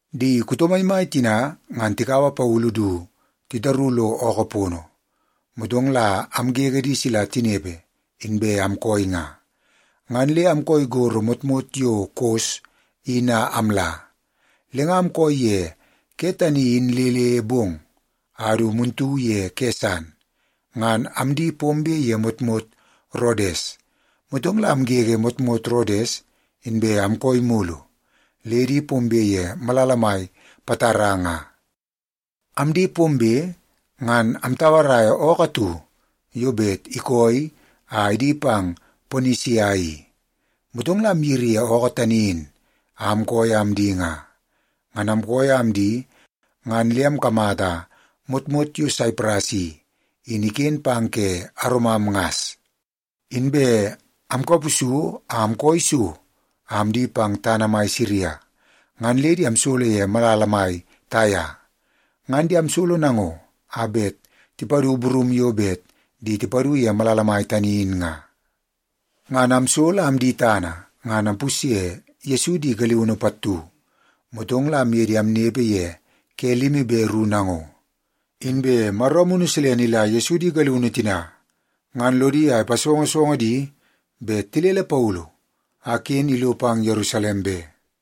Di kuto maimai tina ngan tikaua Paulu du titaru lo ookoo pono, motong la amgege di sila tinepe inbe amkooi nga, ngan le amkooi gorro motmot yo Kos in a amla. Le nga amkooi ye ke tani in le le bong a du muntu ye ke san, ngan amdi pombe ye motmot Rodes. Motong la amgege motmot Rodes, inbe amkooi mulu le di pombe ye malala mai Patara nga. Amdi pombe, ngan amtauaraia ookoo atu yo bet ikooi a idi pang Ponisia i. Motong la amyiri ye ookoo tani in a amkooi a amdi nga. Ngan amkooi a amdi ngan le amkamata motmot yo Saipras i, in iken pang ke aromam ngas. Inbe amkapusu a amkooi so a amdi pang tana mai Siria, ngan le di amsolo ye malala mai Taia. Ngan di amsolo nango a bet tipadu burum yo bet di tipadu ye malala mai tani in nga. Ngan amsolo a amdi tana ngan ampusye Yesu di galiunu pattu, motong la amye di amnepe ye ke limi be ru nango. Inbe Maro Amunu Silene ila Yesu di galiunu tina ngan lodi a ipasongosongo di bet tilele Paulu a ken ilo pang Yerusalem be.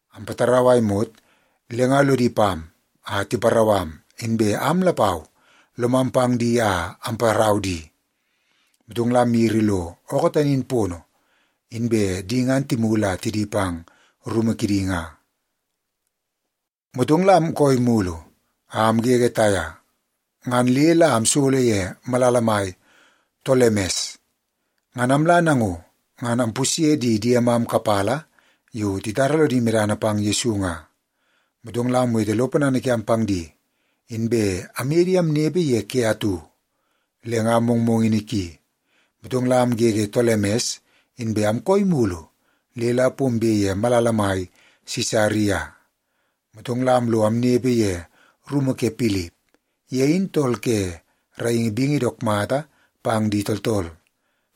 Ampatarau a imot, le nga lodi pam a tiparau am, inbe am lapau lomam pang di a amparau di. Motong la amyiri lo ookoo tani in pono, inbe di ngan timulu a tidi pang rumu kidi nga. Motong la amkooi mulu a amgege Taia, ngan le la amsolo ye malala mai Tolemes. Ngan amla nango, ngan ampusye di diemam kapala yo titara lodi medana pang Yesu nga, motong la amwete lo ponana kiam pang di, inbe amye di amnepe ye ke atu. Le nga mongmongini ki, motong la amgege Tolemes, inbe amkooi mulu le la pombe ye malala mai Sisaria. Motong la amlo amnepe ye rumu ke Pilip. Ye in tool ke raingi bingi dook mata pang di tooltool.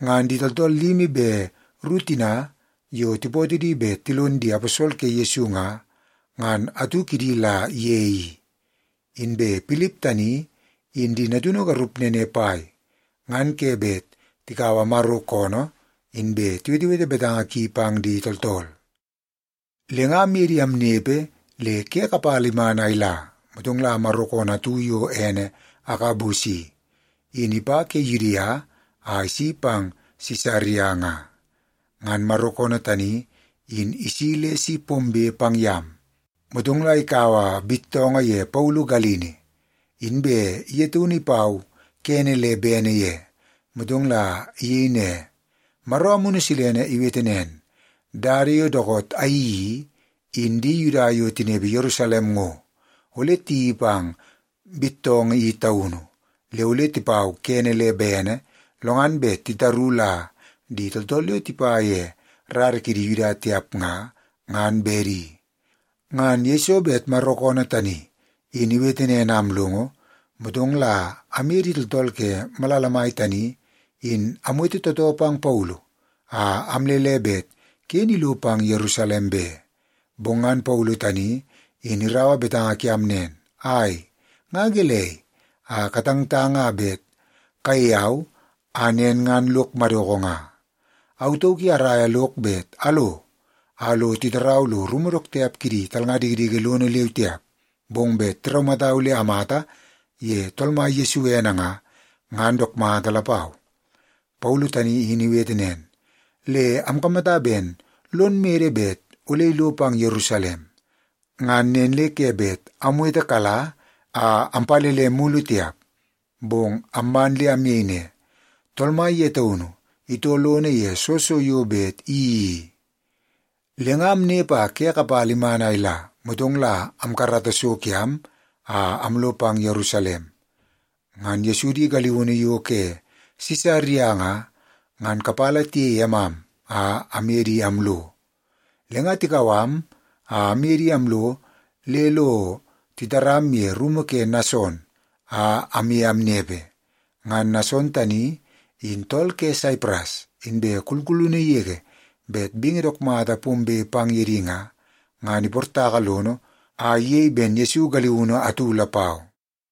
Ngan di tooltool limi be ru tina yo tipootoo di bet tilon di aposol ke Yesu nga, ngan atu kidi la ye i. Inbe Pilip tani in di natunu garup nene pai ngan ke bet tikaua Maro koonoo inbe tiwetewete betanga ki pang di tooltool. Le nga amye di amnepe le ke kapala iman a ila, motong la Maro koonoo atu yo ene Agabus i, in ipa ke Yudia a isi pang Sisaria nga. Ngan Maro koonoo tani in isi le si pombe pang yam, motong la ikaua bittoongoo ye Paulu galini, inbe ye taunu ipau kene le bene ye, motong la iyei ne, “Maro Amunu Silene iwete nen, ‘Dada yo dookoot ayeii i, in di Yuda yo tinepe Yerusalem ngo, ole tiyeii pang bittoongoo i taunu, le ole tipau kene le bene, lo ngan bet titaru la di tooltool yo tipa ye rara kidi Yuda tiap nga, ngan bedi.’” Ngan yeiso bet Maro koonoo tani in iwete nen a amlongo, motong la amye di tooltool ke malala mai tani in amwete tootoo pang Paulu a amlele bet ken ilo pang Yerusalem be. Bong ngan Paulu tani in iraua betanga kiam nen, “Ai, nga gelei a katangtang a bet kayei au a nen ngan lok madoko nga? Au tauk i araia lok bet alo a lo titarau lo rumu dook tiap kidi talnga dikidiki lono leu tiap, bong bet tiraumatau le amata ye Tool Mai Yesu ene nga, ngan dook mata lapau.” Paulu tani in iwete nen, le amkamata ben lon mede bet ole ilo pang Yerusalem. Ngan nen le ke bet amwetekala a ampalele mulu tiap. Bong amman le amyei ne, “Tool Mai ye taunu itoo lono ye soo so yo bet iyeii i.” Le nga amnepe a ke kapala iman a ila, motong la amkarata so kiam a amlo pang Yerusalem. Ngan Yesu di galiunu yo ke Sisaria nga, ngan kapala tiyei emam a amye di amlo. Le nga tikau am a aye di amlo le lo titaram ye rumu ke Nason a amye amnepe. Ngan Nason tani in tool ke Saipras, inbe kulkulunu yege bet bingi dook mata pombe pang ye di nga, ngan iportaka lono a iyei ben Yesu galiunu atu lapau.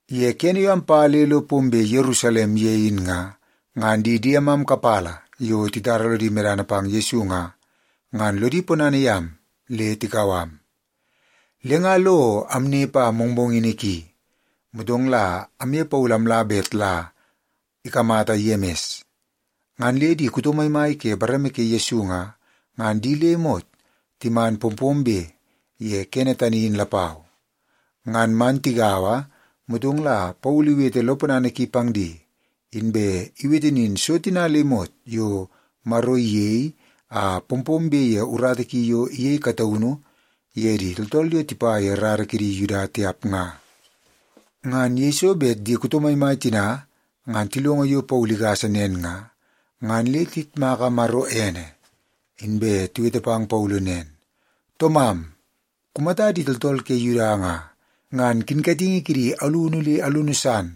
Ye kene yo ampa le lo pombe Yerusalem ye in nga, ngan di diemam kapala yo titara lodi medana pang Yesu nga, ngan lodi ponana yam le tikau am. Le nga lo amnepe a mongmongini ki, motong la amye Paulu amla bet la ikamata Yemis. Ngan le di kuto maimai ke bareme ke Yesu nga, ngan di le imot timan pompombe ye kene tani in lapau. Ngan man tigaua, motong la Paulu iwete lo ponana ki pang di, inbe iwete nin so tina le imot yo Maro iyei a pompombe ye urata ki yo iyei kataunu ye di tooltool yo tipa ye rara kidi Yuda tiap nga. Ngan yeiso bet di kuto maimai tina ngan tilongo yo Paulu igasa nen nga, ngan le tiyitmaka Maro ene. Inbe tiwete pang Paulu nen, “Toomam, kumata di tooltool ke Yuda nga, ngan kinkatingi kidi alunu le alunu san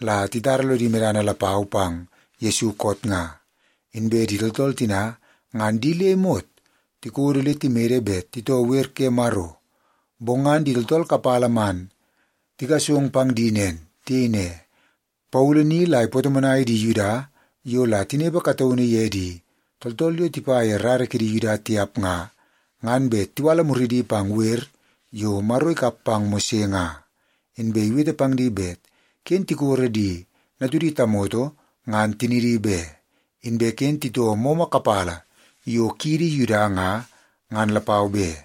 la titara lodi medana lapau pang Yesu koot nga. Inbe di tooltool tina ngan di le imot tikodo le timede bet titoo wer ke Maro. Bong ngan di tooltool kapala man tigasong pang di nen. Tiyei ne, ‘Paulu ni la ipatomonai di Yuda yo la tinepe kataunu ye di tooltool yo tipa ye rara kidi Yuda tiap nga, ngan bet tiwala muridi pang wer yo Maro ikap pang Mose nga. Inbe iwete pang di bet ken tikoro di natudi tamoto ngan tinidi be, inbe ken titoo momo kapala yo kiidi Yuda nga, ngan lapau be.’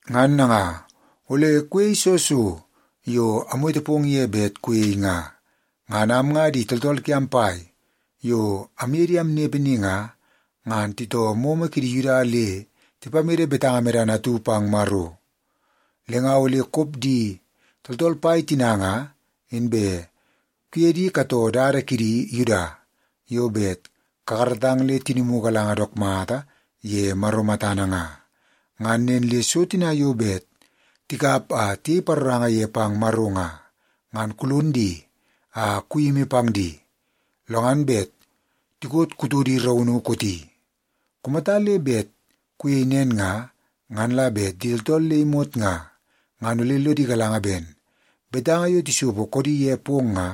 Ngan nanga, ole kuyei soo so yo amwete pong ye bet kuyei nga. Ngan am nga di tooltool kiam pai yo amye di amnepe ni nga, ngan titoo momo kidi Yuda le tipamede betanga medana atu pang Maro. Le nga ole kop di tooltool pai tina nga, inbe kuye di katoo dada kiidi Yuda yo bet kakaratang le tinimu galanga dook mata ye Maro matana nga. Ngan nen le so tina yo bet tikap a tiyei paroranga ye pang Maro nga, ngan kulon di a kuyimi pang di, lo ngan bet tikot kutodi raunu kooti. Kumata le bet kuyei nen nga, ngan la bet di tooltool le imot nga, ngan ole lodi galanga ben betanga yo tisopo koodi ye pong nga,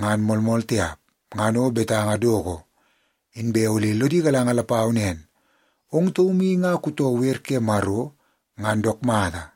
ngan moolmool tiap, ngan o betanga doko. Inbe ole lodi galanga lapau nen, ong taum i nga kutoo wer ke Maro ngan dook mata.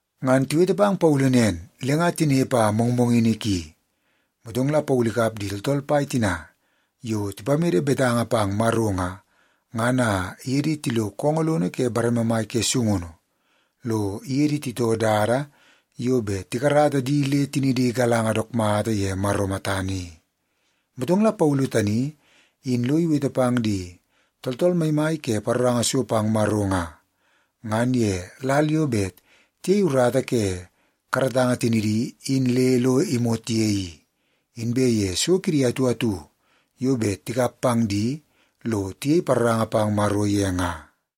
Ngan tiwete pang Paulu nen, le nga tinepe a mongmongini ki, motong la Paulu ikap di tooltool pai tina yo tipamede betanga pang Maro nga, ngan a iye di tilo koongoo lono ke bareme mai ke sungunu, lo iye di titoo dada yo bet tikarata di le tinidi galanga dook mata ye Maro matana i. Motong la Paulu tani in lo iwete pang di tooltool maimai ke paroranga so pang Maro nga, ngan ye lal yo bet tiyei urata ke karatanga tinidi in le lo imot ye i, inbe ye so kidi atu atu yo bet tikap pang di lo tiyei paroranga pang Maro ye nga.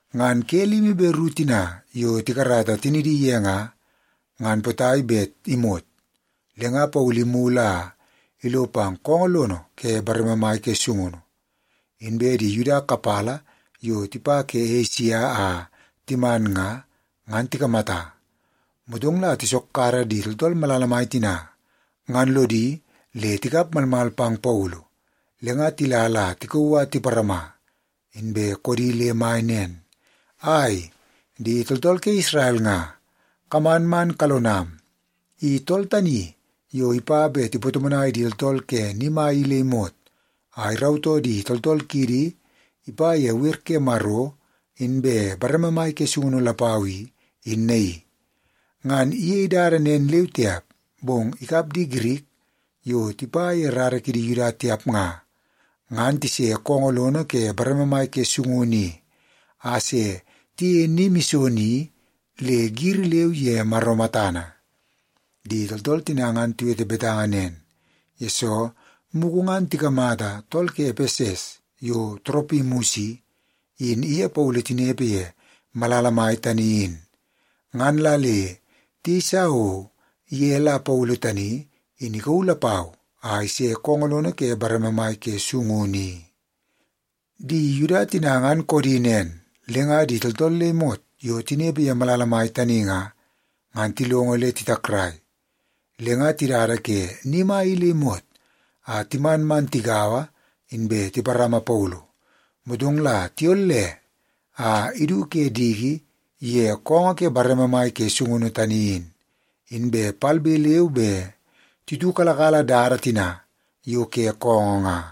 Ngan ke limi be ru tina yo tikarata tinidi ye nga, ngan potai bet imot, le nga Paulu imulu a ilo pang koongoo lono ke bareme mai ke sungunu, inbe di Yuda kapala yo tipa ke tana Esia a timan nga, ngan tikamata. Motong la tisokkara di tooltool malala mai tina ngan lodi le tikap malmal pang Paulu, le nga tila la tikauu a tiparama, inbe koodi le mai nen, “Ai, di tooltool ke Isrel nga, kaman man kalonam! I tool tani yo ipa bet ipatomonai di tooltool ke ni mai i le imot a irautoo di tooltool kiidi ipa ye wer ke Maro inbe bareme mai ke sungunu lapau i, in naii. Ngan iyei dada nen leu tiap, bong ikap di Girik yo tipa ye rara kidi Yuda tiap nga, ngan tise koongoo lono ke bareme mai ke sungunu i a se tiyeie ni mison i, le giri leu ye Maro matana.” (Di tooltool tina ngan tiwete betanga nen, yesoo mugu ngan tikamata tool ke Epeses yo Toropimus i, in iye Paulu tinepe ye malala mai tani in. Ngan la le tiyeisa o ye la Paulu tani in ikauu lapau a ise koongoo lono ke bareme mai ke sungunu i.) Di Yuda tina ngan koodi nen, le nga di tooltool le imot yo tinepe ye malala mai tani nga, ngan tilongo le titakrai. Le nga tidada ke ni mai i le imot a timan man tigaua inbe tiparama Paulu, motong la tiyolle a idu ke diki ye koongoo ke bareme mai ke sungunu tani in. Inbe palbe leu be titiukalakala dada tina yo ke koongoo nga.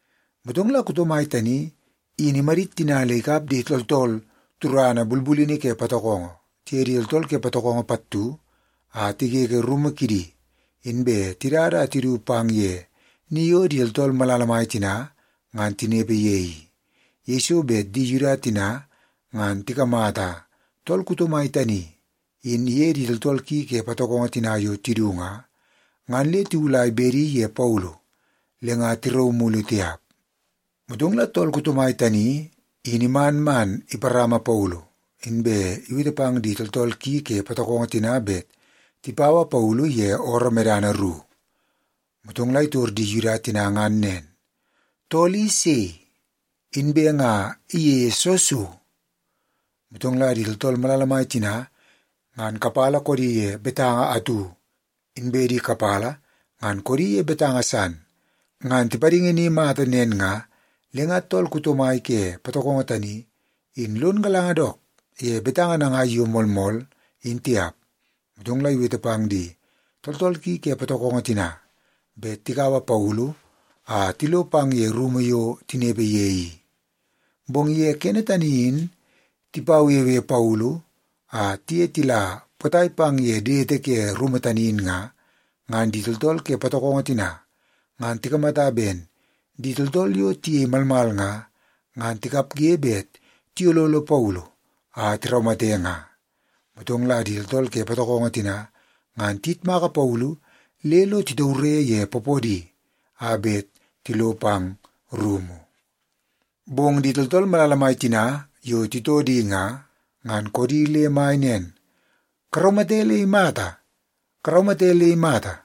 Motong la kuto mai tani in imadit tina le ikap di tooltool turana bulbulini ke patokongo, tiye di tooltool ke patokongo pattu a tigege rumu kidi, inbe tidada a tidu pang ye ni yo di tooltool malala mai tina ngan tinepe ye i. Yeiso bet di Yuda tina ngan tikamata tool kuto mai tani in iye di tooltool ki ke patokongo tina yo tidu nga, ngan le tiwulai bedi ye Paulu le nga tirauu mulu tiap. Motong la tool kuto mai tani in iman man iparama Paulu, inbe iwete pang di tooltool ki ke patokongo tina bet tipaua Paulu ye ooroo medana ru. Motong la itor di Yuda tina ngan nen, “Tool i sei? Inbe nga iyeie soo so?” Motong la di tooltool malala mai tina ngan kapala koodi ye betanga atu, inbe di kapala ngan koodi ye betanga san. Ngan tipadingi ni mata nen nga, le nga tool kuto mai ke patokongo tani in lon galanga dook ye betanga nangai yo moolmool, in tiap. Motong la iwete pang di tooltool ki ke patokongo tina bet tikaua Paulu a tilo pang ye rumu yo tinepe ye i. Bong ye kene tani in tipawewe Paulu a tiye tila potai pang ye dete ke rumu tani in nga, ngan di tooltool ke patokongo tina ngan tikamata ben di tooltool yo tiyei malmal nga, ngan tikapge bet tiyololo Paulu a tiraumate nga. Motong la di tooltool ke patokongo tina ngan tiyitmaka Paulu le lo titaure ye poopoodi a bet tilo pang rumu. Bong di tooltool malala mai tina yo titoo di nga, ngan koodi le mai nen, “Karaumate le imata! Karaumate le imata!”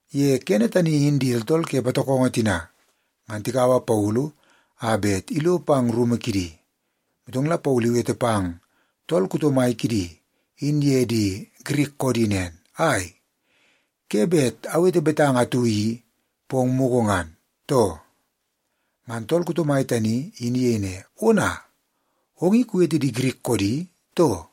Ye kene tani in di tooltool ke patokongo tina ngan tikaua Paulu a bet ilo pang rumu kidi, motong la Paulu iwete pang tool kuto mai kidi in ye di Girik koodi nen, “Ai, ke bet awete betanga atu i pong mugu ngan, too?” Ngan tool kuto mai tani in iyei ne, “Ona, ong i kuwete di Girik koodi, too?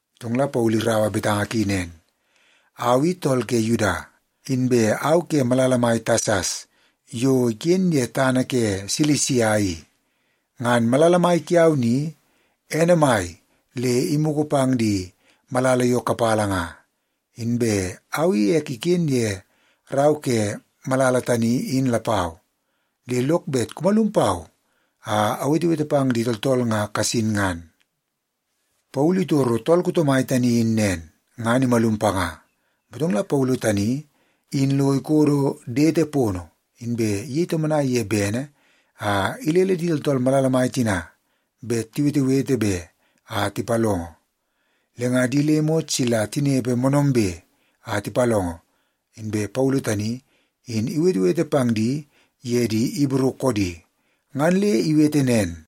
Motong la Paulu iraua betanga ki nen, “Au i tool ke Yuda, inbe au ke malala mai Tasas yo iken ye tana ke Silisia i. Ngan malala mai kiau ni, ene mai le imugu pang di malala yo kapala nga, inbe au i ek iken ye rau ke malala tani in lapau. Le lok bet kumalum pau a awetewete pang di tooltool nga kasin ngan.” Paulu itoro tool kuto mai tani in nen, ngan imalum panga. Motong la Paulu tani in lo ikodo dete pono, inbe iyei tomonai ye bene a ilele di tooltool malala mai tina bet tiwetewete be a tipalongo. Le nga di le imot sila tinepe moonoombe a tipalongo, inbe Paulu tani in iwetewete pang di ye di Ibru koodi. Ngan le iwete nen,